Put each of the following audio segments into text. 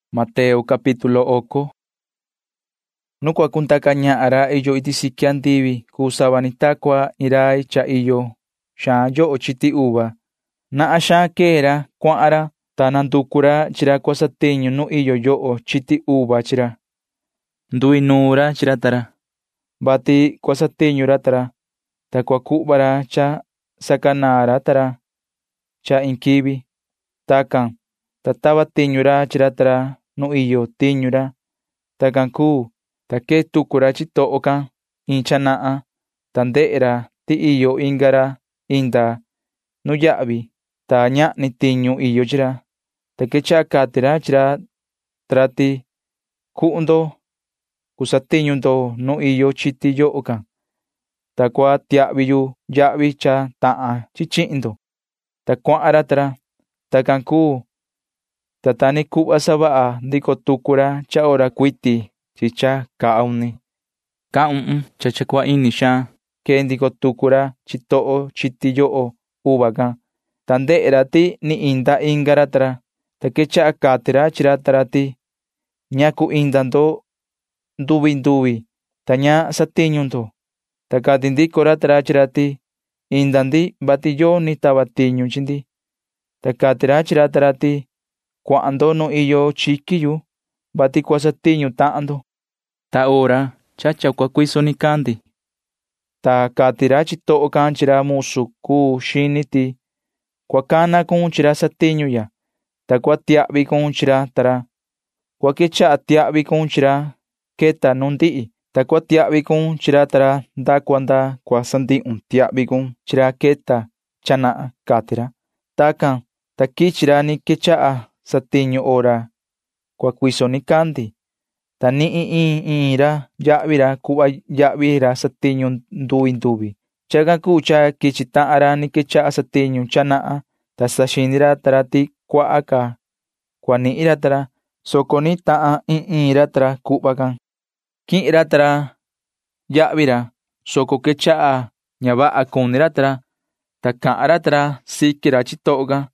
[Ni vii cahan ra Jesuu chi ra sacuaha chi ra:] ’Nu cua cundaca ñahan ra iyo iti siqui andivi cuu sava ni ta cua iin rai cha iyo xaan yoho chiti uva. Nahan xaan quee ra cuahan ra, ta nanducu ra chi ra cua satiñu nu iyo yoho chiti chi ra. Nduinuun ra chi ra ta ra, vati cua satiñu ra ta ra, ta cua cuhva ra cha sacanaan ra ta ra cha iin quivi. Tacan, ta tava tiñu ra chi ra ta ra nu iyo tiñu ra. Tacan cuu, ta quee tucu ra chitoho can caa iin cha nahan, ta ndehe ra ti iyo inga ra inda nuyahvi, ta ñahni tiñu iyo chi ra, ta quechaha cati ra chi ra ta ra ti: “Na cua cuhun tahan ndo satiñu ndo nu iyo chiti yoho can, ta cua tiahvi yu ñaan cha cuu cha vaha,” cati ra, ta cuahan ra ta ra. Tacan cuu, ta ta ni cuhva savaha ndico tucu ra cha hora cuiti chi cha caa uni. Caa uhun cha cua ini xaan quee ndico tucu ra chitoho chiti yoho can, ta ndehe ra ti ni inda inga ra ta ra, ta quechaha cati ra chi ra ta ra ti: “¿Ñacu inda ndo nduvi nduvi, ta ña satiñu ndo?” ta cati ndico ra ta ra chi ra ti: “Inda ndi, vati yoni tava tiñu chi ndi,” ta cati ra chi ra ta ra ti: “Cuahan ndo nu iyo chiqui yu, [vati cua satiñu tahan ndo,]” cati ra. Tacan cuu, ta cua cuiso nicandi, ta cati ra chitoho can chi ra musu cuu xini ti: “Cua cana cun chi ra satiñu ya, ta cua tiahvi cun chi ra ta ra. Cua quechaha tiahvi cun chi ra queta nu ndihi, ta cua tiahvi cun chi ra ta ra nda cua nda cua sandihun tiahvi cun chi ra queta cha nahan,” cati ra. Tacan, ta quichi ra ni quechaha satiñu hora cua cuiso nicandi, ta nihin iin iin ra yahvi ra cuhva yahvi ra satiñu nduvi nduvi. Chacan cuu cha quichi tahan ra ni quechaha satiñu cha nahan, ta saxini ra ta ra ti cuaha ca cua nihin ra ta ra, soco nihin tahan iin iin ra ta ra cuhva can. Quihin ra ta ra yahvi ra, soco quechaha ña vaha cuni ra ta ra, ta cahan ra ta ra siqui ra chitoho can,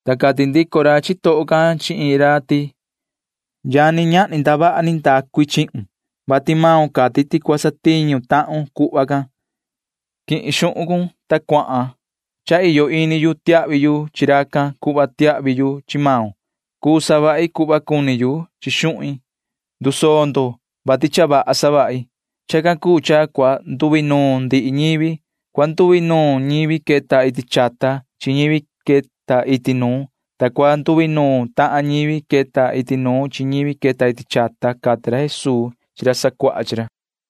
Ta cati ndico ra chitoho can chi iin ra ti: “Yani, ñahni ndavaha ni ndacu i chihun, vati maun cati ti cua satiñu tahun cuhva can. Quihin xuhun cun, ta cuahan. Cha iyo ini yu tiahvi yu chi racan cuhva tiahvi yu chi maun. Cuu savahi cuhva cuni yu chi xuhin. Cha ndusoo ndo, vati cha vaha savahi.” Chacan cuu cha cua nduinuun ndihi ñivi. Cua nduinuun ñivi queta iti chata chi ñivi queta iti nuun, ta cua nduinuun tahan ñivi queta iti nuun chi ñivi queta iti chata ―cati ra Jesuu chi ra sacuaha chi ra.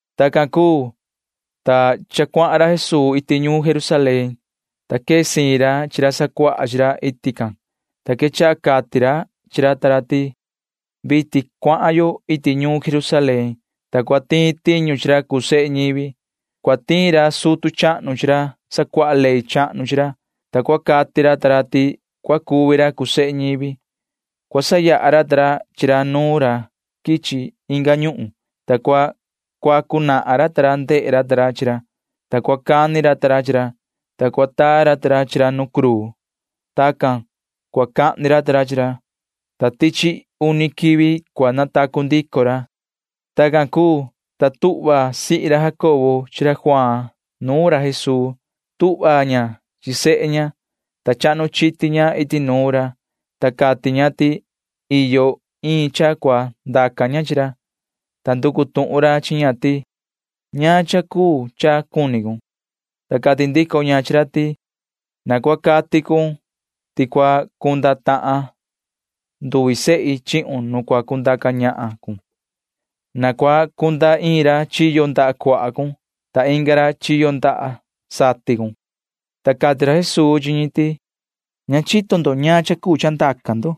Tacan cuu, ta cha cuahan ra Jesuu iti ñuun Jerusalén, ta quee siin ra chi ra sacuaha chi ra iti can, ta quechaha cati ra chi ra ta ra ti: ―Vitin cuahan yo iti ñuun Jerusalén, ta cua tiin tiñu chi ra cuu sehe ñivi. Cua tiin ra sutu chahnu chi ra sacuaha ley chahnu chi ra, ta cua cati ra ta ra ti cua cuvi ra cuu sehe ñivi. Cua sayaha ra ta ra chi ra nuun ra quichi inga ñuhun, vati cua sacateni racan ta ra chi ra, ta cua cani ra ta ra chi ra, ta cua taa ra ta ra chi ra nu cruu. Tacan cua cahni ra ta ra chi ra, ta tichi uni quivi cua natacu ndico ra ―cati ra Jesuu chi ra ta ra. Tacan cuu, ta tuhva sihi ra Jacobo chi ra Juaan nuun ra Jesuu. Tuhva ña chi sehe ña, ta chahnu chiti ña iti nuun ra, ta cati ña ti iyo iin cha cua ndaca ña chi ra, ta nducu tuhun ra chi ña ti: ―¿Ñaan cha cuu cha cuni cun? ―cati ra. Ta cati ndico ña chi ra ti: ―Na cua cati cun ti cua cunda tahan nduvi sehi chihun nu cua cundaca ñahan cun. Na cua cunda iin ra chiyo ndaha cuaha cun ta inga ra chiyo ndaha satin cun ―cati ña. Ta cati ra Jesuu chi ñi ti: ―Ña chito ndo ñaan cha cuu cha ndaca ndo.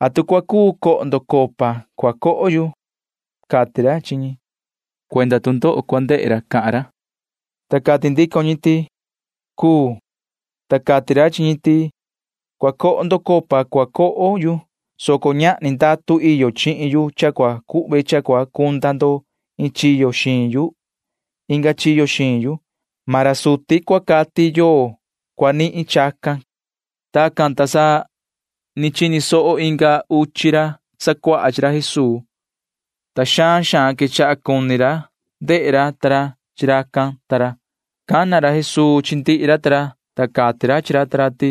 ¿Atu cua cuu coho ndo copa cua coho yu? ―cati ra chi ñi, [soco cuenda tu ndoho cua ndehe ra cahan ra tuhun can]. Ta cati ndico ñi ti: ―Cuu. Ta cati ra chi ñi ti: ―Cua coho ndo copa cua coho yu, soco ñahni ndatu iyo chihin yu cha cua cuhve cha cua cunda ndo iin chiyo xiin yu inga chiyo xiin yu. Maan ra suti cua cati yoo cua nihin chacan ―cati ra. Tacan, ta sa ni chini soho inga uchi ra sacuaha chi ra Jesuu, ta xaan xaan quechaha cuni ra ndehe ra ta ra chi racan ta ra. Cana ra Jesuu chi ndihi ra ta ra, ta cati ra chi ra ta ra ti: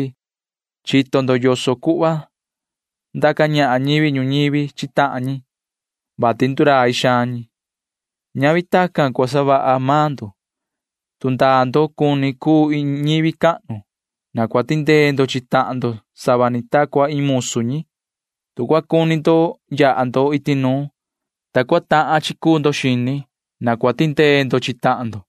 ―Chito ndo yoso cuhva ndaca ñahan ñivi ñuñivi chi tahan ñi, vati ndurai xaan ñi. Ñavi tacan cua savaha maan ndo. Tu ndaa ndo cuni cuu ndo iin ñivi cahnu, na cua tindee ndo chi tahan ndo sava ta cua iin musu ñi. Tu cua cuni ndo yaha ndo iti nuun, ta cua tahan chi cuu ndo xini, na cua tindee ndo chi tahan ndo.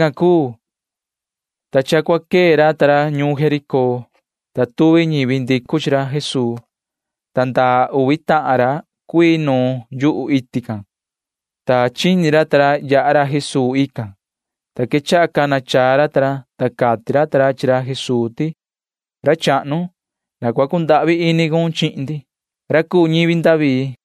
Tacan cuu, ta cha cua quee ra Jesuu ta ra ñuun Jericó, ta tuvi ñivi ndicu chi ra, ta ndaa uvi tahan ra cuii nuun yu iti can. Chini ra ta ra tuhun cha yaha ra Jesuu, ta sa quechaha cana chaa ra ta ra. Cati ra ta ra chi ra Jesuu ti: ―Yoho ra chahnu, na cua cundahvi ini cun chihin ndi, yoho ra cuu ñivi David ―cati ra ta ra.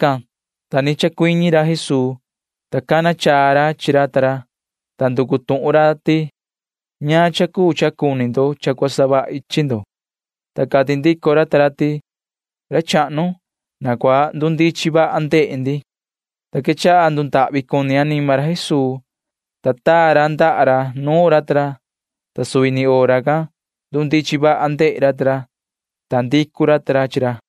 Tacan, ta ni chacuiñi ra Jesuu, ta cana chaa ra chi ra ta ra, ta nducu tuhun ra ti: ―¿Ñaan cha cuu cha cuni ndo cha cua savahi chi ndo? ―cati ra. Ta cati ndico ra ta ra ti: ―Ra chahnu, na cua ndundichin vaha ndehe ndi ―cati ra ta ra. Ta quechaha ndundahvi cuni anima ra Jesuu, ta taa ra ndaha ra nuun ra ta ra, ta suvi ni hora can ndundichin vaha ndehe ra ta ra, ta ndicu ra ta ra chi ra.